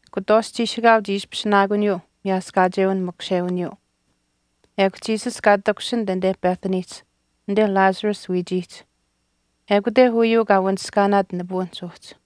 Kutwaashch chiishikaau chii ishpishinaakuniyuu miyaaskaacheu makushewiniyuu, Jesus kaa takushinit anite Bethanyihch anite Lazarus wiichiihch. Ekute uyuu kaa wanishkaanaat nipuwinihch uhchi.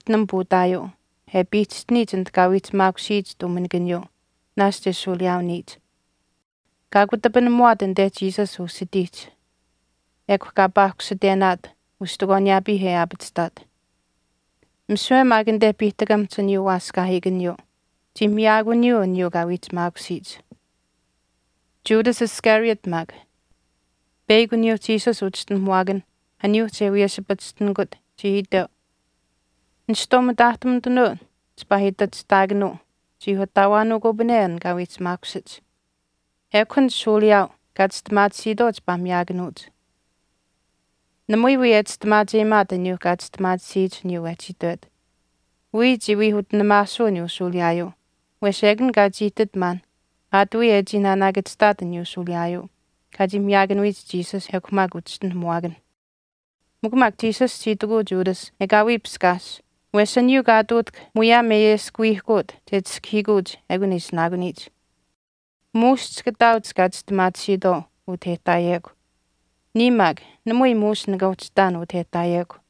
Mary chii uhchi utinam puutaayuu, e piihchishtiniyich anit kaa wiihchimaakusiyich tuuminikaniyuu naashch e shuuliyaaniyich. Kaa kutapinamuwaat anite Jesus usitiihch, ekw kaa paahkusitenaat ustikwaaniyaapii e aapachihtaat. Misiwe maak anite piihtakamihch aniyuu waaskaahiikaniyuu chii miyaakuniyuu aniyuu kaa wiihchimaakusiyich. Judas Iscariot maak, peyakw aniyuu Jesus uchischinuhamuwaakan, aniyuu che wiyeshipachishtinikut, chii itweu, “Nishtwaau mitaahtumitunuu chipaa itachihtaakanuu chii ataawaanuukupane an kaa wiihchimaakushich. Ekw an shuuliyaau kaa chistimaatisiitwaau chipaa miyaakanuuch.” Namui wii e chistimaacheyimaat aniyuu kaa chistimaatisiyich aniyuu wehchi itwet, wiya chii wii utinimaasuu aniyuu shuuliyaayuu wesh ekun kaa chii ihtit maan aat wiya e chii naanaakachihtaat aniyuu shuuliyaayuu kaa chii miyaakanuyich Jesus ekw maak uchischinuhamuwaakanh. Mikw maak Jesus chii itikuu Judas, “Ekaawii piskaas, wesh aniyuu kaa ihtuutahk muyaam e ayeskuwiihkuut che chiskahiikuuch ekun e ishinaakuniyich. Muush chika ihtaauch kaa chistimaatisiitwaau utah e ihtaayekw, niya maak namui muush nika uhchi ihtaan utah e ihtaayekw.”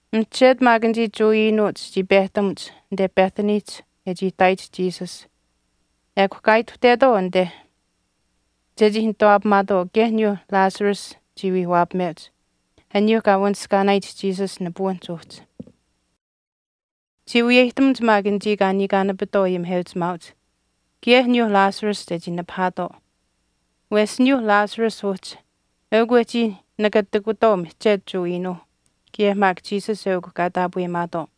Mihchetu maak anichii Jewa iinuuch chii pehtamuch anite Bethanyihch e chii ihtaayich Jesus ekw kaa ituhtetwaau anite chechii nituwaapamaatwaau kaye aniyuu Lazarus chii wii waapameuch, aniyuu kaa wanishkaanaayich Jesus nipuwinihch uhchi. Chii wiyeyihtamuch maak anichii kaa niikaanapitwaau ayimiheuchimaauch kaye aniyuu Lazarus chechii nipahaatwaau. Wesh aniyuuh Lazarus uhchi eukw wehchii nakatikutwaau mihchetu Jewa iinuuh kaye maak Jesus eukw kaa taapweyimaatwaau.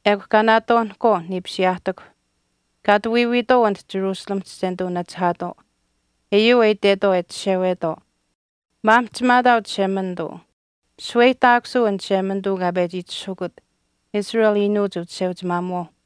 Ekw kaa naatwaanihkwaau niipisiyaahtikw kaa ati wiiwiitwaau anit Jerusalemihch che nituu nachihaatwaau, uyuu e itwetwaau e chishewetwaau, “Maamihchimaataau Chishemanituu, shaweyihtaakusuu an Chishemanituu kaa pechi itishahukut, Israel iinuuch uchisheuchimaamuwaau.”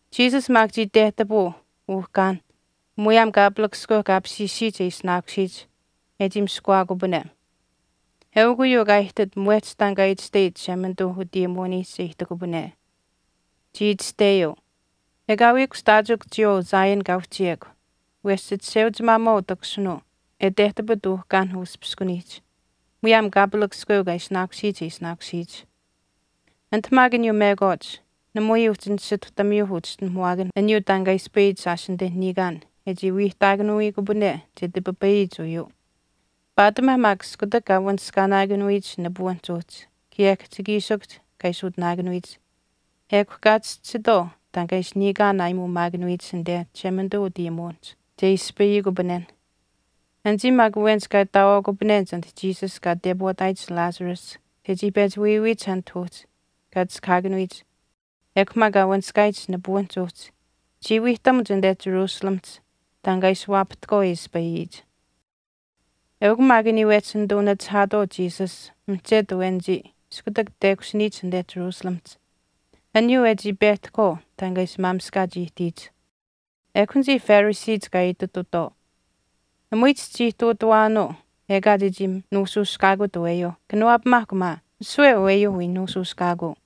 Jesus maak chii tehtapuu uhkaan muyaam kaapalakaskweu kaa apishiishiyich e ishinaakusiyich e chii miskuwaakupane. Eukw uyuu kaa ihtit mwehch taan kaa itashteyich Chishemanituu utayimuwiniihch che ihtikupane. Chii Itashteyuu, Ekaawii kushtaachikw chiyawaau Zion kaa uhchiyekw wesh chichisheuchimaamuwaau takushinuu e tehtapit uhkaanh uspiskuniihch muyaam kaapalakaskweu kaa apishiishiyich kaa ishinaakusiyich ukusiyuu. Anit maak aniyuu mekwaach namui uhchi nisituhtamiyuu uchischinuhamuwaakan aniyuu taan kaa e ispayiyich shaash anite niikaan e chii wiihtaakanuwiikupane che tipipayiyich uyuu. Paatimaa maak iskutak kaa wanishkaanaakanuyich nipuwinihch uhchi kaye kihchikiishikuhch kaa ishi utinaakanuyich ekw kaa chischisitwaau taan kaa ishi niikaan aayimuumaakanuyich anite Chishemanituu utayimuwinihch che ispayikupanen. Anichii maak awenich kaa ihtaawaakupanenich anit Jesus kaa tepwaataayich Lazarus chechii pechi wiiwiyich anit uhchi kaa chiskahaakanuyich ekw maak kaa wanishkaayich nipuwinihch uhchi, chii wiihtamuch anite Jerusalemihch taan kaa ishi waapahtahkwaau e ispayiyich. Eukw maak aniyuu wehchi nituu nachihaatwaau Jesus mihchetu awenichii iskutak tekushiniyich anite Jerusalemihch, aniyuu e chii pehtahkwaau taan kaa ishi maamishkaach ihtiyich. Ekw anichii Phariseech kaa ititutwaau, “Namui chichii ihtuutawaanuu ekaa chechii nuushuushkaakut aweyuu, kanawaapamaahkw maa, misiwe aweyuu wii nuushuushkaakuu.”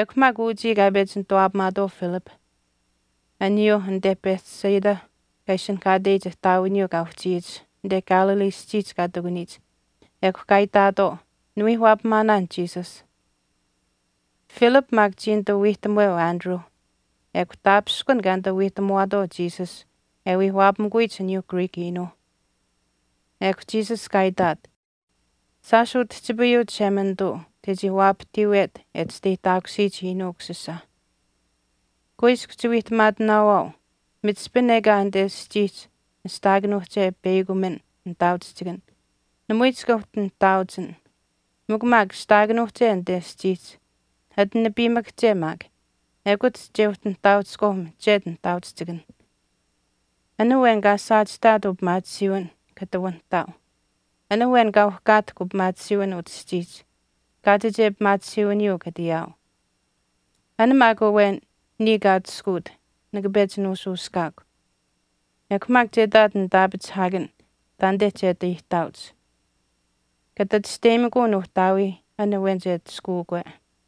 Eukw maak uchii kaa pechi nituwaapamaatwaau Philip, aniyuu anite Bethsaida kaa ishinihkaateyich ihtaawiniyuu kaa uhchiyich anite Galilee aschiihch kaa ihtakuniich, ekw kaa itaatwaau, “Niwii waapamaanaan Jesus.” Philip maak chii nituu wiihtamuweu Andrew ekw taapishkun kaa nituu wiihtamuwaatwaau Jesus e wii waapamikuyich aniyuuh Greek iinuuh. Ekw Jesus kaa itaat, “Shaash utihchipayuu Chishemanituu chechii waapahtiiwet e chisteyihtaakusiyich Iinuu Ukusisa. Kuiskw chiwiihtamaatinaawaau michihpin ekaa anite aschiihch ashtaakanuuhche peyakumin nihtaauchihchikan namui chika uhchi nihtaauchin mikw maak ashtaakanuuhche anite aschiihch ati nipiimakahche maak ekut che uhchi nihtaauchihkwaau mihchetu nihtaauchihchikan. An awen kaa saachihtaat upimaatisiiwin kata wanihtaau. An awen kaa uhkaatahk upimaatisiiwin utah aschiihch kaachiche pimaatisiiwiniyuu kata ayaau. An maak awen niya kaa atushkuut nika pechi nuushuushkaakw. Ekw maak che ihtaat nitaapachihaakan taanite che ati aihtaauch. Kata chisteyimikuu Nuuhtaawiih an awen che atushkuukwe.”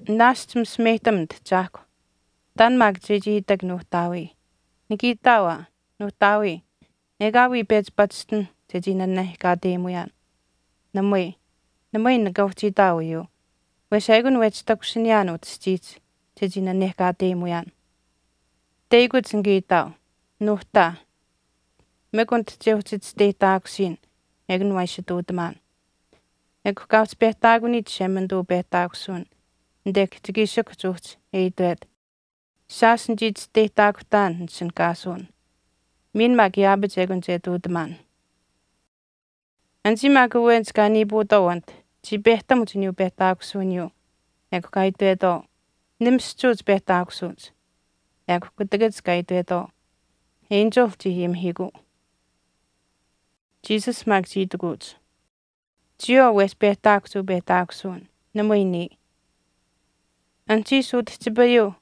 “Naashch misimeyihtam nitahchaahkw, taan maak chechii itak Nuuhtaawii. Nika itaau aa, nuuhtaawii, ekaawii pechi pachishtin chechii nanehkaateyimuyaan. Namui, namui nika uhchi itaau uyuu wesh ekun wehchi takushiniyaan utah aschiihch chechii nanehkaateyimuyaan. Teyakuch nika itaau, Nuuhtaa, mikw anit chechii uhchi chisteyihtaakusiyin, eukun waa ishi ihtuutamaan.” Ekw kaa uhchi pehtaakuniyich Chishemanituu upehtaakusuwin anite kihchikiishikuhch uhchi e itwet, “Shaash nichii chisteyihtaakuhtaan nitishinihkaasuwin miin maak yaapach ekun che ihtuutamaan.” Anichii maak awenich kaa niipuutwaau anite chii pehtamuch aniyuu pehtaakusuwiniyuu ekw kaa itwetwaau, “Nimischuuch pehtaakusuuch.” Ekw kutakach kaa itwetwaau, “Enchil chii ayimihiikuu.” Jesus maak chii itikuuch, “Chiyawaau wehchi pehtaakuhch uu pehtaakusuwin, namui niya. Anuhchiish utihchipayuu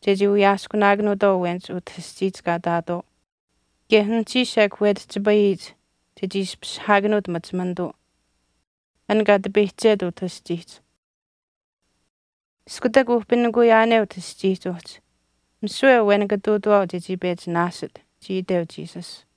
chechii wiyaaskunaakanuutwaau awenich utah aschiihch kaa ihtaatwaau kaye anuhchiish ekw wetihchipayiyich chechii ishpishihaakanuut machimanituu, an kaa tipeyihchet utah aschiihch. Iskutak uhpinikuyaane utah aschiihch uhchi, misiwe awen nika ihtuutawaau chechii pechi naasit,” chii iteu Jesus.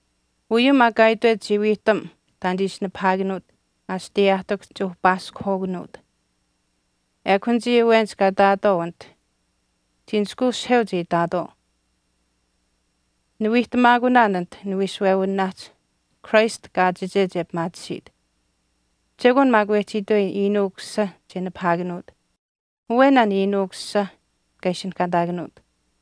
Uyuu maak kaa itwet chii wiihtam taan che ishi nipahaakanuut asiteyaahtikuhch che uhpaaskuhwaakanuut. Ekw anichii awenich kaa ihtaatwaau anit chii nishkweushiheuch e itaatwaau, “Niwiihtamaakunaan anite niwiishuwewinaahch Christ kaachiche che pimaatisiit. Chekwaan maak wehchi itweyin, Iinuu Ukusisa che nipahaakanuut. Awen an Iinuu Ukusisa kaa ishinihkaataakanuut.”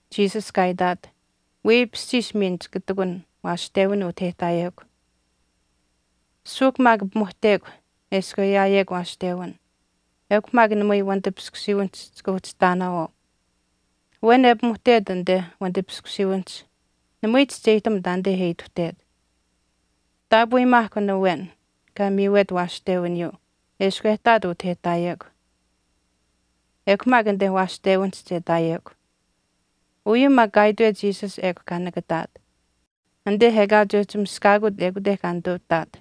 Jesus kaa itaat, “Weipishchiish miin chika ihtakun waashtewin utah e ihtaayekw. Suuhk maak pimuhtekw eshkw e ayaayekw waashtewin ekw maak namui wanitipiskusiiwinihch chika uhchi ihtaanaawaau. Awen e pimuhtet anite wanitipiskusiiwinihch namui chischeyihtam taanite e ituhtet. Taapweyimaahkw an awen kaa miiwet waashtewiniyuu eshkw e ihtaat utah e ihtaayekw, ekw maak anite waashtewinihch che ihtaayekw.” Uyuu maak kaa itwet Jesus ekw kaa nakataat, anite ekaa che uhchi miskaakut ekute kaa nituu ihtaat.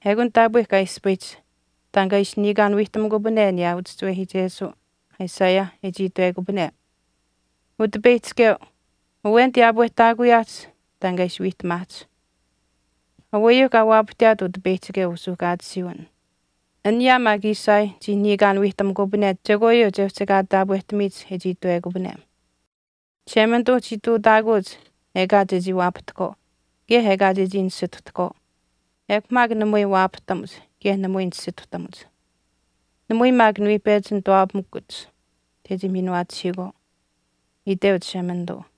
Eukun taapwe kaa ispayihch taan kaa ishi niikaan wiihtamukupane aniyaa uchischiwehiichesuu Isaiah e chii itwekupane, Utipeyihchikeu, awen tiyaapwehtaakuyaahch taan kaa ishi wiihtamaahch. Aweyuu kaa waapahtiyaat Utipeyihchikeu usuuhkaatisiiwin. Aniyaa maak Isaiah chii niikaan wiihtamukupane chekwaayuu che uhchi ekaa taapwehtamiyich e chii itwekupane, Chishemanituu chii ihtuutaakuuch ekaa chechii waapahtahkwaau kaye ekaa chechii nisituhtahkwaau, ekw maak namui waapahtamuch kaye namui nisituhtamuch. Namui maak niwii pechi nituwaapamikuch chechii miinuwaachihiikwaau, iteu Chishemanituu.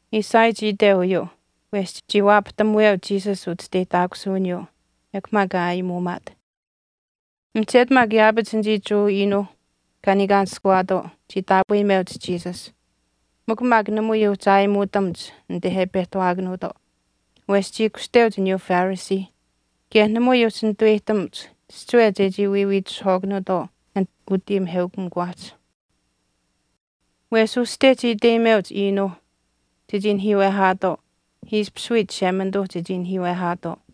Isaiah chii iteu uyuu wesh chii waapahtamuweu Jesus uchisteyihtaakusuwiniyuu, ekw maak kaa aayimuumaat. Mihchetu maak yaapach anichii Jewa iinuuh kaa niikaanishkuwaatwaau chii taapweyimeuch Jesus mikw maak namui uhchi aayimuutamuch anite e pehtawaakanuutwaau wesh chii kushteuch aniyuu Phariseeh kaye namui uhchi nituweyihtamuch chihchiwe chechii wiiwiitishihwaakanuutwaau anit utayimiheukamikuwaahch. Wesh uste chii iteyimeuch iinuuh chechii nahiiwehaatwaau ishpish wii Chishemanituu chechii nahiiwehaatwaau.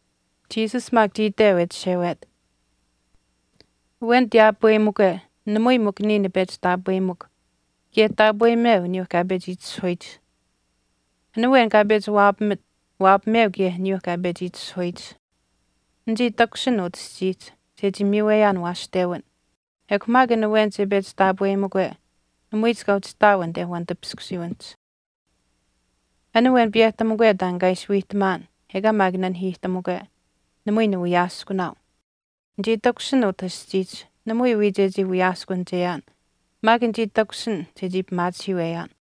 Jesus maak chii itweu e chishewet, “Awen tiyaapweyimikwe namui mikw niya nipechi taapweyimikw kaye taapweyimeu aniyuu kaa pechi itishahuyich. An awen kaa pechi waapamit, waapameu kaye aniyuu kaa pechi itishahuyich. Nichii takushin utah aschiihch chechii miiweyaan waashtewin. Ekw maak an awen che pechi taapweyimikwe namui chika uhchi ihtaau anite wanitipiskusiiwinihch. An awen piyehtamukwe taan kaa ishi wiihtamaan ekaa maak nanihiihtamukwe, namui niwiyaaskunaau. Nichii takushin utah aschiihch namui wii chechii wiyaaskunicheyaan maak nichii takushin chechii pimaachihiiweyaan.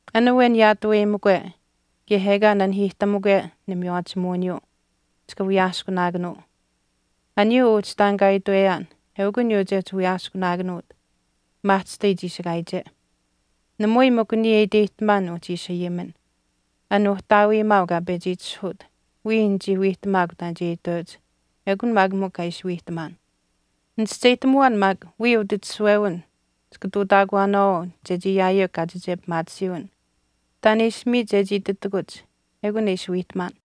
An awen yaatuweyimikwe, kaye ekaa nenahiihtamukwe nimiywaachimuwiniyuu, chika wiyaaskunaakanuu. Aniyuu uhchi taan kaa itweyaan eukw aniyuu che uhchi wiyaaskunaakanuut maahchishtai chiishikaayiche. Namui mikw niya e iteyihtamaan nuuhchi ishi ayimin. An Uhtaawiimaau kaa pechi itishahuut wiya nichii wiihtamaakw taan che iteuch ekun maak mikw kaa ishi wiihtamaan. Nichischeyihtamuwaan maak wiya utitishuwewin chika ihtuutaakuwaanaawaau chechii ayaayekw kaachiche pimaatisiiwin. Taan e ishi miit chechii ititakuch ekun e ishi wiihtamaan.”